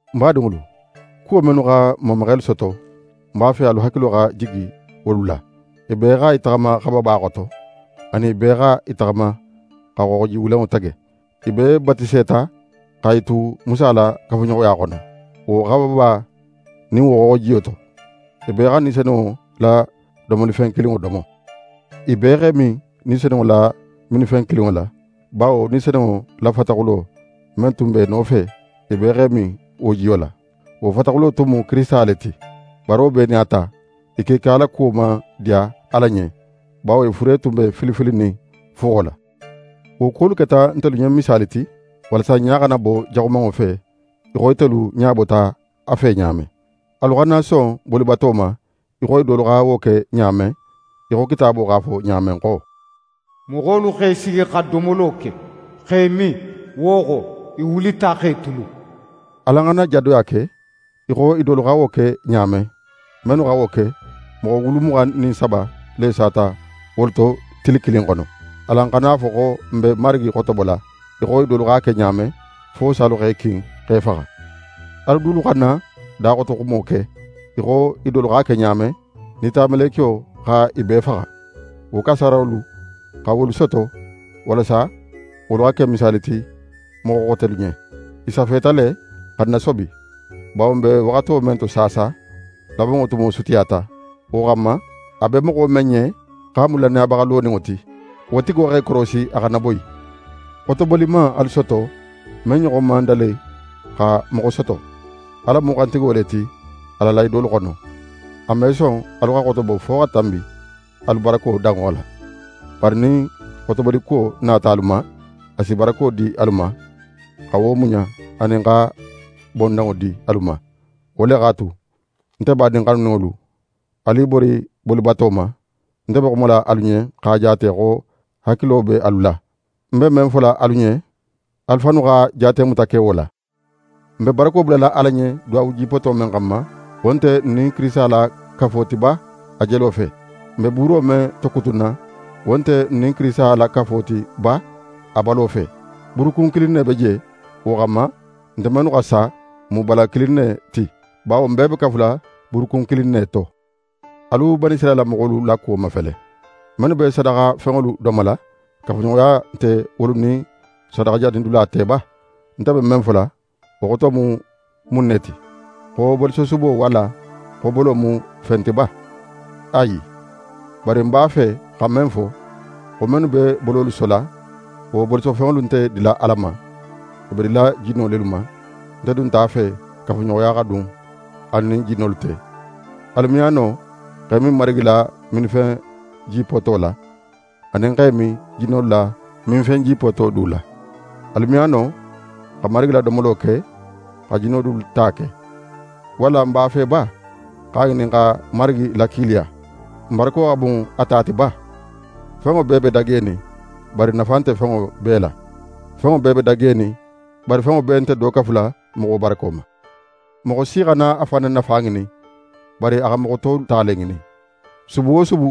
Ń badinŋolu, kuwo mennu xa n mamaxelu soto, ń b'a fe alu hakilo xa jigi wolu la. I bee xa i taxama xababa xoto; anin i bee xa i taxama xa Xooxoji Wulenŋo tege. I bee batiseta xa i tu Musa la kafuɲoxoya xono, wo xababa nin wo xooxojiyo to. I bee xa Ni Senunŋo la domolifen kilinŋo domo. I bee x'e min Ni Senunŋo la minfen kilinŋo la; bawo Ni Senunŋo la fataxulo men tun b'e nofe, i bee x'e min wo jiyo la. Wo fataxulo tun mu Kirisita le ti. Bari wo bee nin a ta, i kiika la kuwo man diya Ala ɲen; bawo i fure tun be fili filinin fuxo la. Wo kuwolu keta ntelu ɲen misaali ti, walasa n ɲa xana bo jaxumanŋo fe, í xo itelu ɲa bota a fe ɲa men. Alu xana son bolibato ma í xo i dolu xa wo ke ɲa men; í xo Kitaabo x'a fo ɲa men xo: «Moxolu x'e sigi xa domolo ke, x'e min, wo xo, i wulita x'e tulun.» Alan xana jadoya ke í xo i dolu xa wo ke ɲa men. Mennu xa wo ke, moxo wulu muxan nin saba le sata wolu to tili kilin xono. Alan xana a fo xo n be Marigi xotobola í xo i dolu x'a ke ɲa men, fo salu x'e kin x'e faxa. Alu dulu xana daxotoxumo ke í xo i dolu x'a ke ɲa men, nitamelekiyo xa i bee faxa. Wo kasaarolu xa wolu soto walasa wolu xa ke misaali ti moxo xotelu ɲen. I safeta le xa n nasobi; bawo n be waxato men to saasa, labanŋo tumo sutiyata. Wo xanma, a be moxo men ɲen xo a mu lannayabaxa loninŋo ti, wo tigo x'é korosi a xana boyi. Xotoboli man alu soto men ɲoxon man dali xa moxo soto. Ala mu xantigo le ti a la lahidolu xono. A me son alu xa xotobo fo xa tanbi alu barako danŋo la; bari nin xotobolikuwo nata alu ma, a si barako di alu ma, xa wo muɲa anin xa bondanŋo di alu ma. Wo le x'a tu, nte badin xanuninŋolu, alu i bori bolibato ma. Nte be xumala alu ɲen x'a jaate xo hakilo be alu la. Ń be men fola alu ɲen, alu fannu xa jaatemuta ke wo la. N be barako bulala Ala ɲen duwawo jipoto men xanma, wo nte n nin Kirisita la kafo ti ba a jelo fe? N be buuro men tokutunna, wo nte n nin Kirisita la kafo ti ba a balo fe? Buurukun kilin ne be je. Wo xanma, nte mennu xa sa, n mu bala kilin ne ti; bawo n bee be kafula buurukun kilin ne to. Alu Banisirayila moxolu la kuwo mafele: Mennu be sadaxafenŋolu domola, kafuɲoxoya nte wolu nin sadaxajanidula te ba? Nte be men fola, wo xoto mu mun ne ti? Xo bolisosubo walla xo bolo mu fen ti ba? Ayi! Bari ń b'a fe xa men fo, xo mennu be bololu sola, wo bolisofenŋolu nte dila Ala ma, i be dila jinno lelu ma. Nte dun nte a fe kafuɲoxoya xa dun alu nin jinnolu te. Alu me a no x'e min Marigi la minfen jipoto la, anin x'e min jinnolu la minfen jipoto du la. Alu me a no xa Marigi la domolo ke, xa jinno dulu ta ke. Walla n b'a fe ba x'a ŋinin xa Marigi lakiiliya? N barako xa bun a ti ba? Fenŋo bee be dagenin, bari nafa nte fenŋo bee la. Fenŋo bee be dagenin, bari fenŋo bee nte do kafula moxo barako ma. Moxo si xana a fan na nafa ŋinin, bari a xa moxo tolu ta le ŋinin. Subu wo subu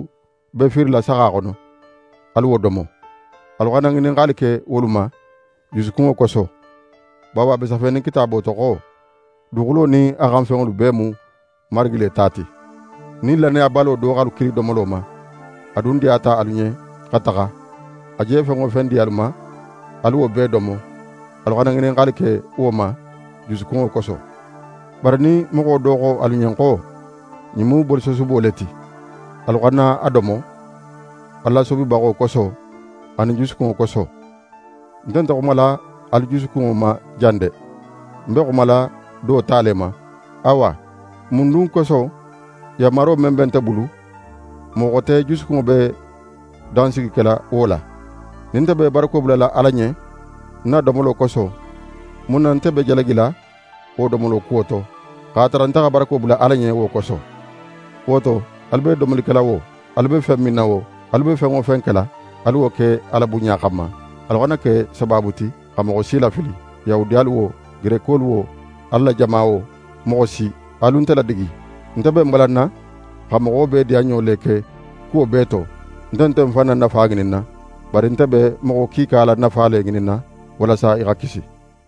be fiirila saxa xono, alu wo domo. Alu xana ŋininxali ke wolu ma, jusukunŋo koso. Bawo a be safenin Kitaabo to xo: «Duguxulo nin a xan fenŋolu bee mu Marigi le ta ti.» Nin lannayabalo do x'alu kili domolo ma, a dun diyata alu ɲen xa taxa, a je fen wo fen di alu ma, alu wo bee domo; alu xana ŋininxali ke wo ma, jusukunŋo koso. Bari nin moxo do xo alu ɲen xo: «Ɲin mu bolisosubo le ti», alu xana a domo alu lasobibaxo koso anin jusukunŋo koso. Nte nte xumala alu jusukunŋo ma jan de! Ń be xumala do ta le ma. Awa, mun dun koso, yanmaro men be nte bulu, moxo xote jusukunŋo be dansigi kela wo la? Nin nte be barako bulala Ala ɲen ń na domolo koso, mun na nte be jalagila wo domolo kuwo to, x'a tara nte xa barako bula Ala ɲen wo koso? Wo to, alu be domoli kela wo, alu be fen minna wo, alu be fen wo fen kela, alu wo ke Ala bunɲa xanma. Alu xana ke sabaabu ti xa moxo si lafili, Yahudiyalu wo, Gerekolu wo, Ala la jama wo, moxo si. Alu nte ladigi; nte be ń balanna xa moxo bee diyanɲo le ke kuwo bee to. Nte nte ń fan na nafa ŋininna; bari nte be moxo kiika la nafa le ŋininna walasa i xa kisi.